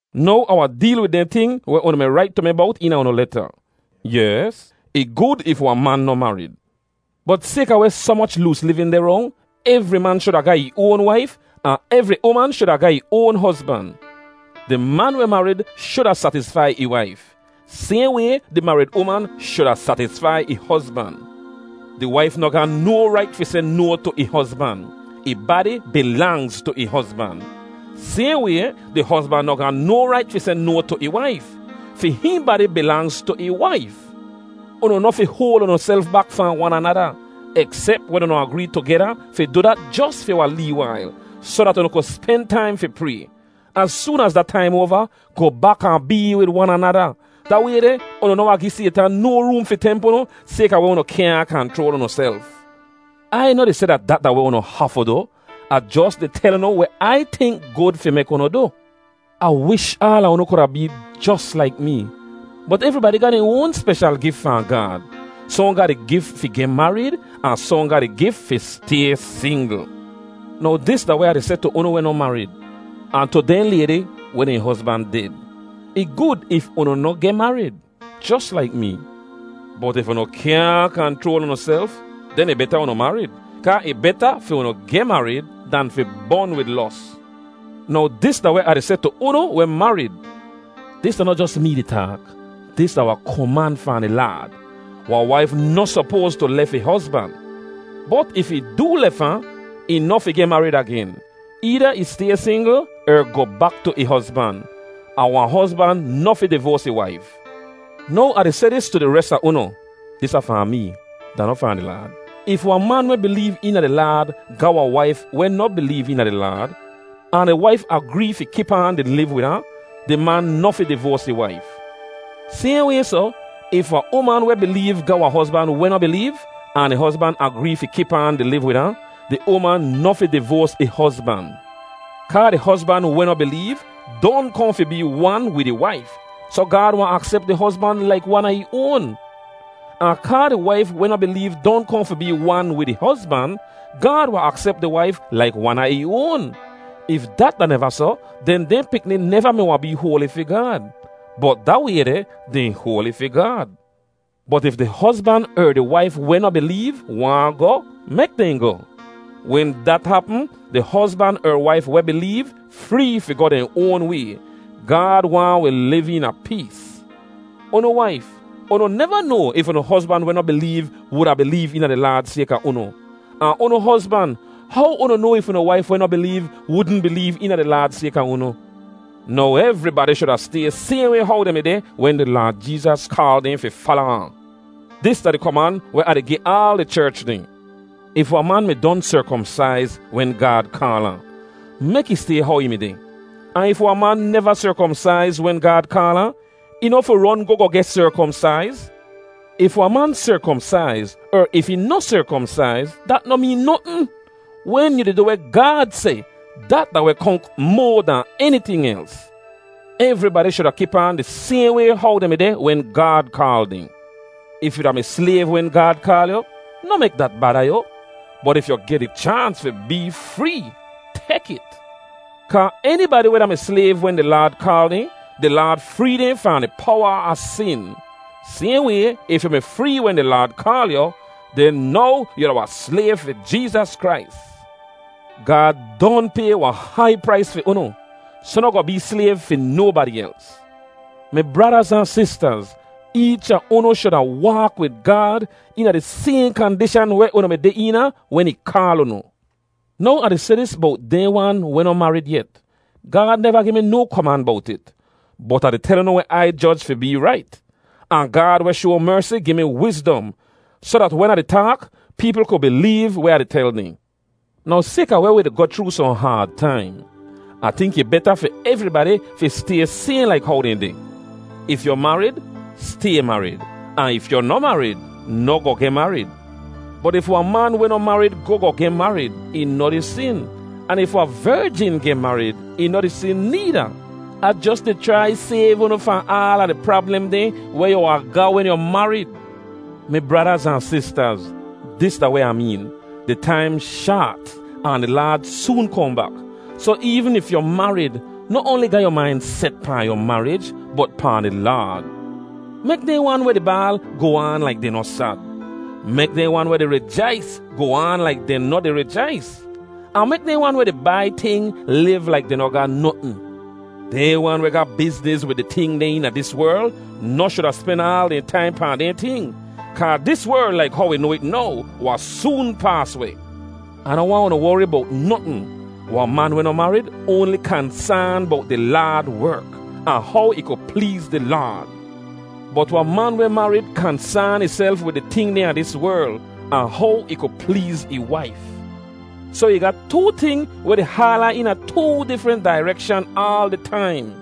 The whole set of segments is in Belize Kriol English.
Now, Ah wahn deel wid dehn ting weh unu mi rait tu mi bowt eena unu leta. Yes, ih gud if wahn man noh marid. Bot sayka weh soh moch loos livin deh rong, evri man shuda ga ih oan waif ahn evri uman shuda ga ih oan hozban. Di man weh marid shuda satisfai ih waif. Sayhn way, di marid uman shuda satisfai ih hozban. Di waif noh ga no rait fi seh no tu ih hozban. Ih badi bilangz tu ih hozban. Sayhn way, di hozban noh ga no rait fi seh no tu ih waif. Fi hihn badi bilangz tu ih waif. Unu noh fi hoal unuself bak fahn wan anada, eksep wen unu agree tugeda fi du dat jos fi wahn lee wail, soh dat unu ku spen taim fi pray. Az soon az da taim oava, goh bak ahn bee wid wan anada. Da way deh, unu noh wahn gi Saytan no room fi temp unu sayka weh unu kyaahn kanchroal unuself. Ai noh di seh dat dat da weh unu hafu du. Ah jos di tel unu weh Ai tink gud fi mek unu du. Ah wish aala unu kuda bee jos laik mee. Bot evribadi ga dehn oan speshal gif fahn Gaad. Sohn ga di gif fi geh marid, ahn sohn ga di gif fi stay singl. Now dis da weh Ah di seh tu unu weh noh marid, ahn tu dehn laydi weh dehn hozban ded: Ih gud if unu noh geh marid, jos laik mee. Bot if unu kyaahn kanchroal unuself, den ih beta unu marid, kaa ih beta fi unu geh marid dan fi bon wid los. Now dis da weh Ah di seh tu unu weh marid. (Dis da noh jos mee di taak; dis da wahn koman fahn di Laad.) Wahn waif noh sopoas tu lef ih hozban. Bot if ih doo lef ahn, ih noh fi geh marid agen. Eeda ih stay singl, er goh bak tu ih hozban. Ahn wahn hozban noh fi divoas ih waif. Now Ah di seh dis tu di res a unu (dis da fahn mee; da noh fahn di Laad.) If wahn man weh bileev eena di Laad ga wahn waif weh noh bileev eena di Laad, ahn di waif agree fi kip aan di liv wid ahn, di man noh fi divoas ih waif. Sayhn way soh, if wahn uman weh bileev ga wahn hozban weh noh bileev, ahn di hozban agree fi kip aan di liv wid ahn, di uman noh fi divoas ih hozban. Kaa di hozban weh noh bileev don kohn fi bee wan wid ih waif, soh Gaad wahn aksep di hozban laik wan a ih oan. Ahn kaa di waif weh noh bileev don kohn fi bee wan wid ih hozban, Gaad wahn aksep di waif laik wan a ih oan. If dat da neva soh, den dehn pikni neva mi wahn bee hoali fi Gaad. Bot da way deh, dehn hoali fi Gaad. Bot if di hozban er di waif weh noh bileev waahn goh, mek dehn goh. Wen dat hapm, di hozban er waif weh bileev free fi goh dehn oan way. Gaad waahn wi liv eena pees. Unu waif, unu neva noa if unu hozban weh noh bileev wuda bileev eena di Laad sayka unu. Ahn unu hozban, how unu noa if unu waif weh noh bileev wudn bileev eena di Laad sayka unu? Now, evribadi shuda stay sayhn way how dehn mi deh wen di Laad Jeezas kaal dehn fi fala ahn. Dis da di koman weh Ah di gi aal di cherch dehn. If wahn man mi don serkomsaiz wen Gaad kaal ahn, mek ih stay how ih mi deh. Ahn If wahn man neva serkomsaiz wen Gaad kaal ahn, ih noh fi ron goh goh geh serkomsaiz. If wahn man serkomsaiz er if ih noh serkomsaiz, dat noh meen notn. Wen yu di du weh Gaad seh, dat da weh konk moa dahn eniting els. Evribadi shuda kip aan di sayhn way how dehn mi deh wen Gaad kaal dehn. If yu da-mi slayv wen Gaad kaal yu, noh mek dat bada yu. Bot if yu geh di chaans fi bee free, tek it. Kaa enibadi weh da-mi slayv wen di Laad kaal dehn, di Laad free dehn fahn di powa a sin. Sayhn way, if yu mi free wen di Laad kaal yu, den now yu da wahn slayv fi Jeezas Krais. Gaad don pay wahn hai prais fi unu, soh noh goh bee slayv fi nobadi els. Mi bradaz ahn sistaz, eech a unu shuda waak wid Gaad eena di sayhn kandishan weh unu mi deh eena wen ih kaal unu. Now Ah di seh dis bowt dehn wan weh noh marid yet: Gaad neva gi mi no koman bowt it, bot Ah di tel unu weh Ai joj fi bee rait. Ahn Gaad weh shoa mersi gi mi wizdom, soh dat wen Ah di taak, peepl ku bileev weh Ah di tel dehn. Now sayka weh wi di goh chroo sohn haad taim, Ah tink ih beta fi evribadi fi stay sayhn laik how dehn deh. If yu marid, stay marid. Ahn if yu noh marid, noh goh geh marid. Bot if wahn man weh noh marid goh goh geh marid, ih noh di sin. Ahn if wahn verjin geh marid, ih noh di sin needa. Ah jos di chrai sayv unu fahn aala di prablem dehn weh yu wahn ga wen yu marid. Mi bradaz ahn sistaz, dis da weh Ah meen: Di taim shaat ahn di Laad soon kohn bak. Soh eevn if yu marid, noh oanli ga yu main set pahn yu marij, bot pahn di Laad. Mek dehn wan weh di baal goh aan laik dehn noh sad. Mek dehn wan weh di rijais goh aan laik dehn noh di rijais. Ahn mek dehn weh di bai ting liv laik dehn noh ga notn. Dehn wan weh ga bizniz wid di ting dehn eena dis werl noh shuda spen aal dehn taim pahn dehn ting. Kaa dis werl laik how wi noa it now, wahn soon paas weh. Ah noh waahn unu wori bowt notn. Wahn man weh noh marid oanli kansaan bowt di Laad werk, ahn how ih ku pleez di Laad. Bot wahn man weh marid kansaan ihself wid di ting dehn a dis werl, ahn how ih ku pleez ih waif. Soh ih ga too ting weh di haal ahn eena too difrent dairekshan aal di taim.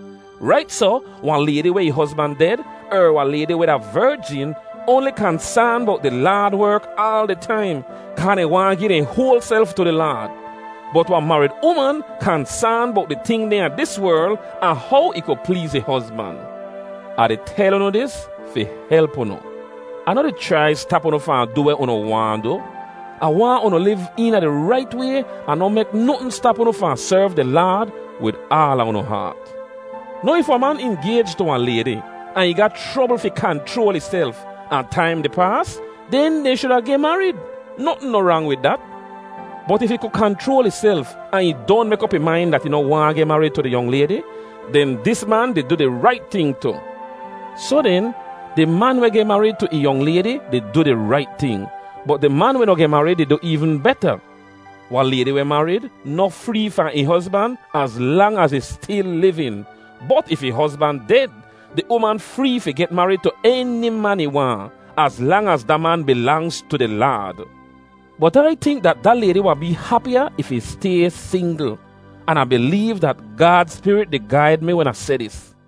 Rait soh, wahn laydi weh ih hozban ded, er wahn laydi weh da verjin, oanli kansaan bowt di Laad werk aal di taim, kaa dehn waahn gi dehn hoal self tu di Laad. Bot wahn marid uman kansaan bowt di ting dehn a dis werl, ahn how ih ku pleez ih hozban. Ah di tel unu dis fi help unu. Ah noh di chrai stap unu fahn du weh unu waahn du. Ah waahn unu liv eena di rait way ahn noh mek notn stap unu fahn serv di Laad wid aala unu haat. Now if wahn man ingayj tu wahn laydi, ahn ih ga chrobl fi kanchroal ihself, ahn taim di paas, den dehn shuda geh marid. Notn noh rang wid dat. Bot if ih ku kanchroal ihself ahn ih don mek op ih main dat ih noh waahn geh marid tu di yong laydi, den dis man di du di rait ting tu. Soh den, di man weh geh marid tu ih yong laydi di du di rait ting. Bot di man weh noh geh marid di du eevn beta. Wahn laydi weh marid noh free fahn ih hozban az lang az ih stil livin. Bot if ih hozban ded, di uman free fi geh marid tu eni man ih waahn, az lang az da man bilangz tu di Laad. Bot Ai tink dat da laydi wahn bee hapiya if ih stay singl. An Ah bileev dat Gaad Spirit di gaid mi wen Ah seh dis.